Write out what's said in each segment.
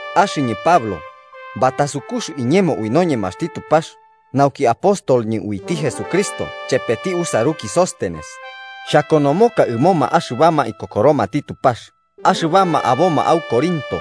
Axɨñɨ Pablo, batasukux iñemo ui noñemaxti Tupax nauki apostolñɨ uiti Jesucristo chepeti usaruki Sóstenes, xhakonomoka ɨmoma axɨbama ikokoromati Tupax axɨbama aboma au Corinto,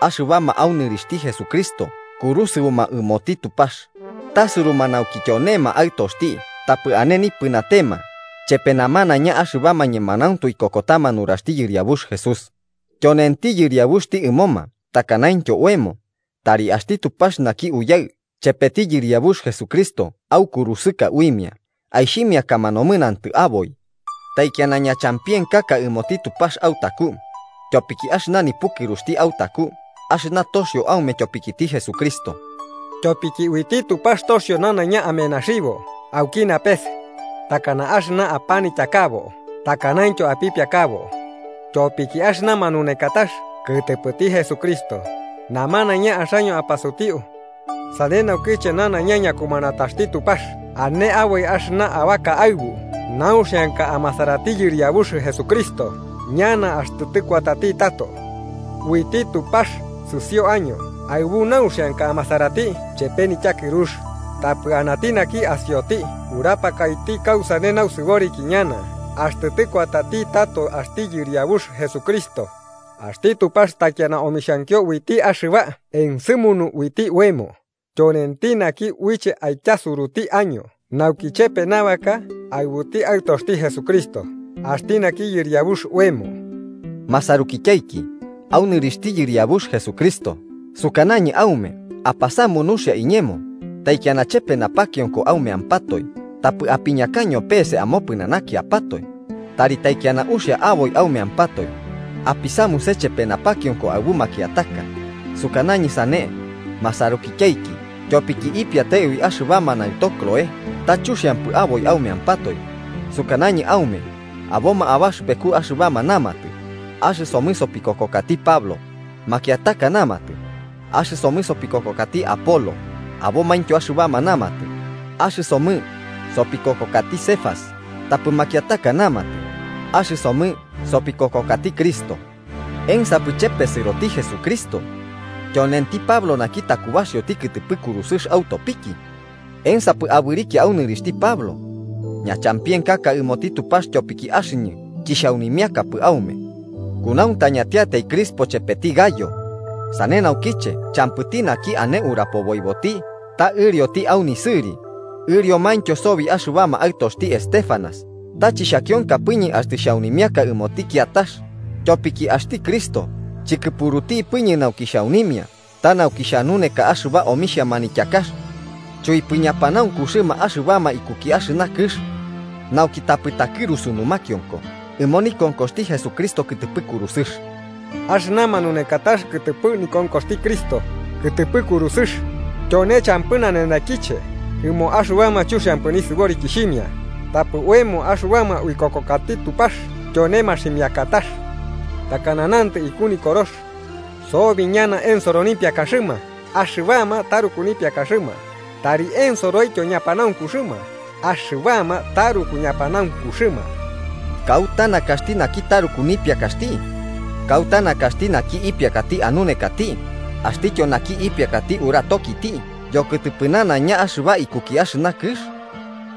axɨbama au nɨrixhti Jesucristo kurusɨoma ɨmoti Tupax, tasuruma nauki tyonema aɨtoxti tapɨ ane nipɨnatema chepe namanaiña axɨbama ñemanauntu ikokotama nuraxti Yɨriabux Jesús, tyonenti Yɨriabuxti ɨmoma takanaintyo oemo. Tari axti Tupax naki Uyaɨ chepeti Yɨriabux Jesucristo aukurusɨka uimia aixhimiakama nomɨnantɨ aboi. Taikiana ñachampienkaka ɨmoti Tupax autaku, tyopiki axɨna nipukɨruxti autaku, axɨna toxio aume tyopikiti Jesucristo. Tyopiki uiti Tupax toxio nanaiña amenaxibo auki napes, takana axɨna apanityakabo takanaintyo apipiakabo, tyopiki axɨna manunekatax kɨtɨpɨti Jesucristo namanaiña axaño apasutiu. Sane naukiche nanaiña ñakumanataxti Tupax ane aboi axɨna abaka aɨbu nauxianka amasarati Yɨriabux Jesucristo ñana axtɨ tɨkuatati tato. Uiti Tupax sɨsio año aɨbu nauxianka amasarati chepe nityakɨrux, tapɨ anati naki asioti urapakaiti kausane nausɨboriki ñana axtɨ tɨkuatati tato axti Yɨriabux Jesucristo. Axti Tupax taikiana omixhankio uiti axɨba ensɨmunu uiti oemo, tyonenti naki uiche aityasuruti año nauki chepe nabaka aɨbuti Aɨtoxti Jesucristo, axti naki Yɨriabux oemo. Masarukityaiki, au nɨrixhti Yɨriabux Jesucristo sukanañɨ aume apasamu nuxia iñemo taikiana chepe napakionko aumeampatoe tapɨ apiñakaño peese amopɨnanakiapatoe, tari taikiana uxia aboi aumeampatoe, apisamuse chepe napakionko aɨbu makiataka. Sukanañɨ sane, masarukityaiki tyopiki ipiate ui axɨbama naɨto Cloé, ta chuxiampɨ aboi aumeampatoe. Sukanañɨ aume aboma abaxɨpeku axɨbama namatɨ: “Axɨsomɨ sopikokokati Pablo”. Makiataka namatɨ: “Axɨsomɨ sopikokokati Apolo”. Abomaintyo axɨbama namatɨ: “Axɨsomɨ sopikokokati Cefas.” Tapɨ makiataka namatɨ: “Axɨsomɨ sopikokokati Cristo.” ¿Ensapɨ chepesɨroti Jesucristo? ¿Tyonenti Pablo naki takubaxioti kɨtɨpɨ kurusɨx autopiki? ¿Ensapɨ abɨrikia au nɨrixhti Pablo? ¡Ñachampienkaka ɨmoti Tupax, tyopiki axɨñɨ chixhaunimiakapɨ aume, kunauntañatiatai Crispo chepeti Gayo! Sane naukiche champɨti naki ane urapoboiboti ta ɨrioti au nisɨri. Ɨriomaintyo sobi axɨbama aɨtoxti Estéfanas, ta chixhakionkapɨñɨ axtɨ xhaunimiaka ɨmoti kiatax, tyopiki axti Cristo chikɨpurutipɨñɨ nauki xhaunimia, ta nauki xhanuneka axɨba omixhia manityakax, chuipɨ ñapanaunkuxɨma axɨbama ikuki axɨna kɨx, nauki tapɨ takɨrusu numakionko ɨmo nikonkoxti Jesucristo kɨtɨpɨ kurusɨx. Axɨna manunekatax kɨtɨpɨ nikonkoxti Cristo kɨtɨpɨ kurusɨx tyone champɨ nanenekiche ɨmoma axɨbama chuxiampɨ nisɨborikixhimia, tapɨ oemo axɨbama uikokokati Tupax tyone maximiakatax. Takana nantɨ iku Nikorox: “Sobi ñana ensoro nipiakaxɨma axɨbama taruku nipiakaxɨma tari ensoroityo ñapanaunkuxɨma axɨbama taruku ñapanaunkuxɨma.” ¿Kauta nakaxti naki taruku nipiakaxti? ¿Kauta nakaxti naki ipiakati anunekati, axtityo naki ipiakati uratokiti yokɨtɨpɨ nanaiña axɨba ikuki axɨna kɨx?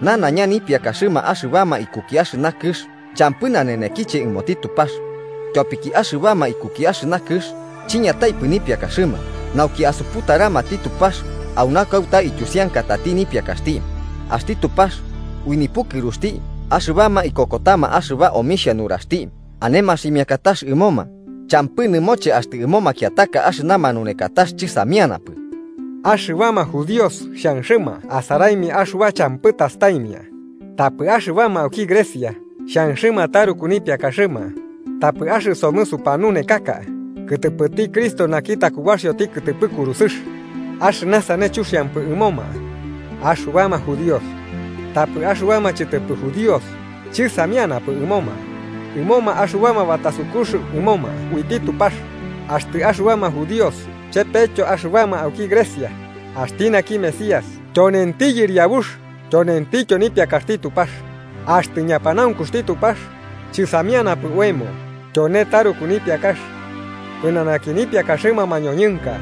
¡Nanaiña nipiakaxɨma axɨbama ikuki axɨna kɨx champɨ nanenekiche ɨmoti Tupax! Tyopiki axɨbama ikuki axɨna kɨx chiñataipɨ nipiakaxɨma nauki asuputaramati Tupax, auna kauta ityusiankatati nipiakaxti, axti Tupax ui nipukɨruxti axɨbama ikokotama axɨba omixhia nuraxti ane maximiakatax ɨmoma, champɨ nɨmoche axtɨ ɨmo makiataka axɨna manunekatax chɨsamianapɨ. Axɨbama judíos xhanxɨma asaraimia axɨba champɨ tastaimia, tapɨ axɨbama auki Grecia xhanxɨma taruku nipiakaxɨma, tapɨ axɨsomɨ supanunekaka kɨtɨpɨti Cristo naki takubaxioti kɨtɨpɨ kurusɨx, axɨna sane chuxiampɨ ɨmoma axɨbama judíos, tapɨ axɨbama chɨtɨpɨ judíos chɨsamianapɨ ɨmoma, ɨmoma axɨbama batasukux ɨmoma uiti Tupax, axtɨ axɨbama judíos chepetyo axɨbama auki Grecia, axti naki Mesías tyonenti yɨriabux tyonentityo nipiakaxti Tupax. Axtɨ ñapanaunkuxti Tupax chɨsamianapɨ oemo tyone taruku nipiakax pɨnanaki nipiakaxɨma mañoñɨnka.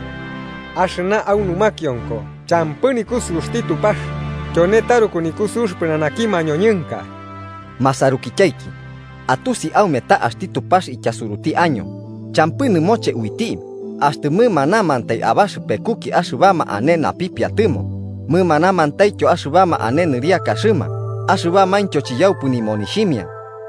Axɨna au numakionko champɨ nikusɨuxti Tupax tyone taruku nikusɨux pɨnanaki mañoñɨnka. Masarukityaiki, atusi aume ta axti Tupax ityasuruti año champɨ nɨmoche uiti axtɨ mɨmanamantai abaxɨpekuki axɨbama ane napipiatɨmo, mɨmanamantaityo axɨbama ane nɨriakaxɨma axɨbamaintyo chiyaupɨ nimonixhimia.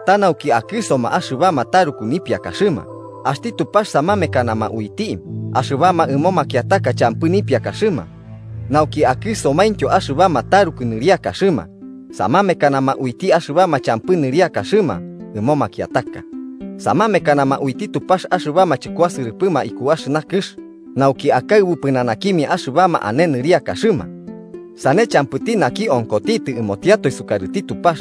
Ta nauki akɨsoma axɨbama taruku nipiakaxɨma, axti Tupax samamekanama uiti axɨbama ɨmo makiataka champɨ nipiakaxɨma. Nauki akɨsomaintyo axɨbama taruku nɨriakaxɨma, samamekanama uiti axɨbama champɨ nɨriakaxɨma ɨmo makiataka. Samamekanama uiti Tupax axɨbama chɨkuasɨrɨpɨma iku axɨna kɨx, nauki akaɨbu pɨnanakimia axɨbama ane nɨriakaxɨma. Sane champɨti naki onkotitɨ ɨmotiatoe sukarɨti Tupax.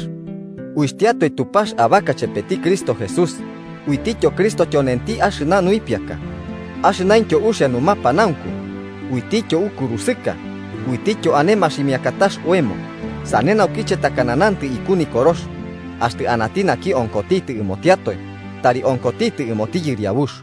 Uitiatoe Tupax abaka chepeti Cristo Jesús, uitityo Cristo tyonenti axɨna nuipiaka, axɨnaintyo uxia numapanaunku, uitityo ukurusɨka uitityo ane maximiakatax oemo. Sane naukiche, takana nantɨ iku Nikorox: “Axtɨ anati naki onkotitɨ ɨmotiatoe, tari onkotitɨ ɨmoti Yɨriabux.”